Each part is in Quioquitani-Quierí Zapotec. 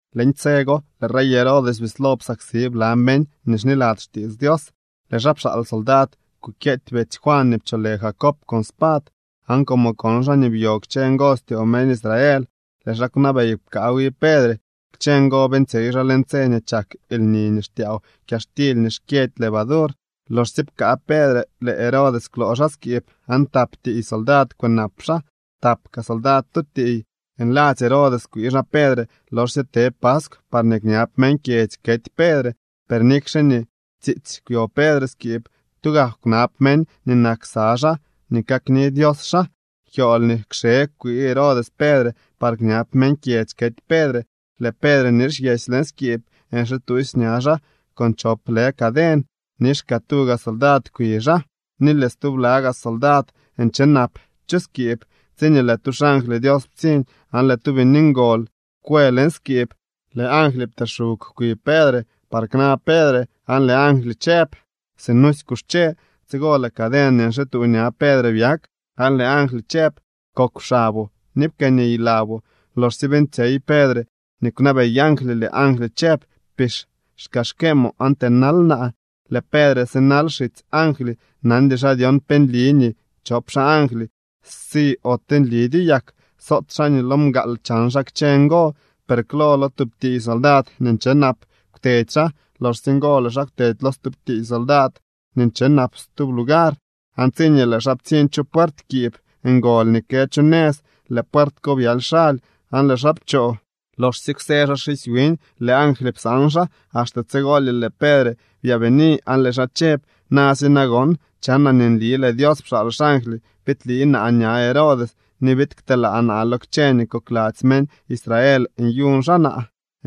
Leñ tse go lëë rey Herodes bislo psaksi bla meñ nii xniladzy xtiits Dios. Lëë xaa pxaal soldad kukyeety betsy Juan nii pcholë Jacob con spad, aan como kon xaa nii byo kchë ngo styoo meñ Israel, lëë xaa kwnabey pkaa wi Pedre. Kchë ngo beeñtsyey xaa leñ tse nii chak lni nii xtyaaw kyaxtily nii xkyëdy levadur. Loxsye pkaa Pedre, lëë Herodes kwloo xaa skiib, aan tap tiiy soldad kwënap xaa, tap kaa soldad tu tiiy. Nladzy Herodes kwii xaa Pedre loxsye te paskw parñee kñab meñ kyedzy kety Pedre. Per nikxe nii tsiitsy kwyo Pedre skiib, tugak kwnab meñ nii nak ksa xaa nii kakni Dios xaa. Kyool nii kxe kwii Herodes Pedre par kñab meñ kyedzy kety Pedre. Lëë Pedre nixyesy leñ skiib nxituusy ña xaa con chop lë caden. Nix kaa tuga soldad kwi xaa, ni lëë stubla gaa soldad nche nap chu skiib, tsiñee lëë tu xangly Dios ptsiñ, aan lëë tu bini ngol kwë leñ skiib. Lëë angly pteexug kwi Pedre par kna Pedre, aan lëë angly chëb: —Sinusy kuxche. Tsigo lëë caden nii nxituu ña Pedre byak, aan lëë angly chëb: —Kokw xaboo ni pkëëniy laboo. Loxsye beeñtsyey Pedre nii kwnabey angly, lëë angly chëb: —Pix xkaxkeemoo aan tënal naa. Lëë Pedre sinal xitsy angly, nandy xaa dyon pe nli nii chop xaa angly si ote nlidyo yak. Soot xaa nii lo mgaal chan xaa kchë ngo. Per klo lo tub tiiy soldad nii nche nap kwtedy xaa. Loxsye ngo lëë xaa kwtedy lo stub tiiy soldad nii nche nap stub lugar. Aan tsiñee lëë xaa ptsiñ chu puert kiib ngol nii kë chu nëz, lëë puert ko byaly xaly aan lëë xaa pchoo. Loxsye kwsë xaa xisy wiñ, lëë angly psaan xaa. Axte tsigolye lëë Pedre byaabini aan lëë xaa chëb: —Na si nagon, chanaa nii nli lëë Dios pxaal xangly biidlii naa ña Herodes ni biid kteelaa naa lo kchë nii kokladzy meñ Israel nyuñ xaa naa.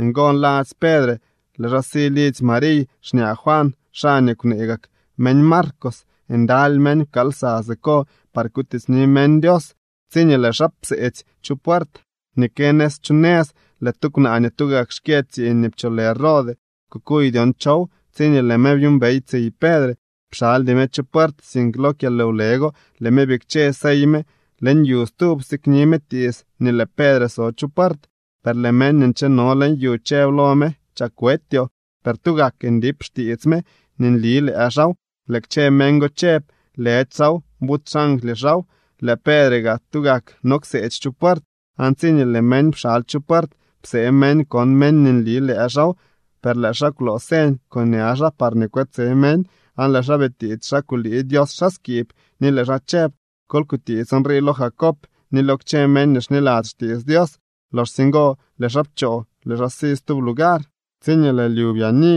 Ngo nladzy Pedre lëë xaa si lidzy Mariy, xñaa Juan, xaa nii kwnee gak meñ Marcos. Ndaly meñ pkaal lsa siko par kutiitsni meñ Dios. Tsiñee lëë xaa pseetsy chu puert nii kë nëz chu nëz, lëë tu kwnaa nii tugak xkyë tsiiñ nii pcholë Rode kukuy dyon chow. Tsiñee lëë me byuumbey tsiy Pedre, pxaldy me chu puert, sink lo kyalwle go lëë me bikche sey me leñ yu stub, sikni me tiits nii lëë Pedre so chu puert. Per lëë meñ nii ncheno leñ yu chëb lo me: —¡Chak wetyoo! Per tugak ndip xtiits me nii nli lëë xaaw. Lëë kchë meñ go chëb: —Lëdy xaaw, buty xangly xaaw. Lëë Pedre gaa tugak no kseetsy chu puert. Aan tsiñee lëë meñ pxaly chu puert, psee meñ kon meñ nii nli lëë xaaw. Per lëë xaa kwloo señ con ña xaa parñee kwetse meñ, aan lëë xaa bitiits xa kulii Dios xaa skiib, ni lëë xaa chëb: —Kol kutiits nrii lo Jacob ni lo kchë meñ nii xniladzy xtiits Dios. Loxsye ngo lëë xaa pchoo, lëë xaa si stub lugar. Tsiñee lëë lyu byaani,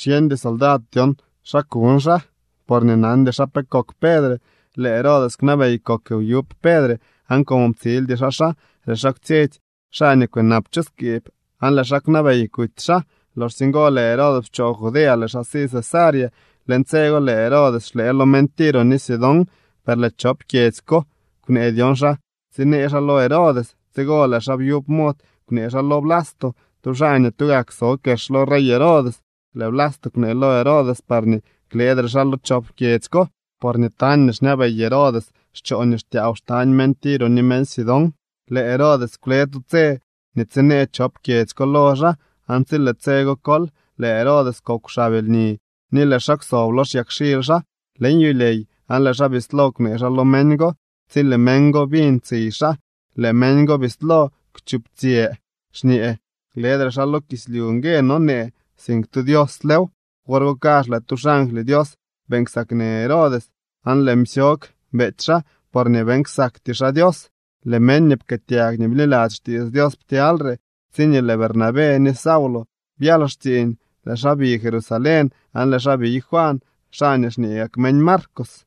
xyeñdy soldad dyon xa kuñ xaa, porñee nandy xaa pe kok Pedre. Lëë Herodes kwnabey kok wyub Pedre, aan como ptsildy xaa xaa, lëë xaa kwtsyetsy xaa nii kwënap chu skiib aan lëë xaa kwnabey kuty xaa. Loxsye ngo lëë Herodes pchoo Judea, lëë xaa si Cesarea. Leñ tse go lëë Herodes xlëë lo meñ Tiro ni Sidón, per lëë chop kyedzy ko kwnee dyon xa tsinee xaa lo Herodes. Tsigo lëë xaa byub mod kwnee xaa lo Blasto, tu xaa nii tugak so kex lo rey Herodes. Lëë Blasto kwnee lo Herodes parñee klëëdre xaa lo chop kyedzy ko, porñee tañ nii xñabey Herodes xchoo nii xtyaaw xtañ meñ Tiro ni meñ Sidón. Lëë Herodes kwle tu tse nii tsinee chop kyedzy ko lo xaa. Aan tsi lëë tse go kol, lëë Herodes kokw xab lni ni lëë xaa kwsob lo xyakxily xaa leñ yulyey aan lëë xaa bislo kwnee xaa lo meñ go. Tsi lëë meñ go biñ tsiy xaa, lëë meñ go bislo kwchuptsyë xñee: —¡Lëdre xaa lo kislyu ngue nonee, sink tu dioslew! Wor go kazh lëë tu xangly Dios beeñ ksaknë Herodes aan lëë msyog beety xaa porñee beeñ ksakty xaa Dios. Lëë meñ nii pkëëtyag ni bniladzy xtiits Dios ptyalyre. Tsiñee lëë Bernabé ni Saulo byal xtsiiñ, lëë xaa bi Jerusalén, aan lëë xaa biy Juan, xaa nii xñee gak meñ Marcos.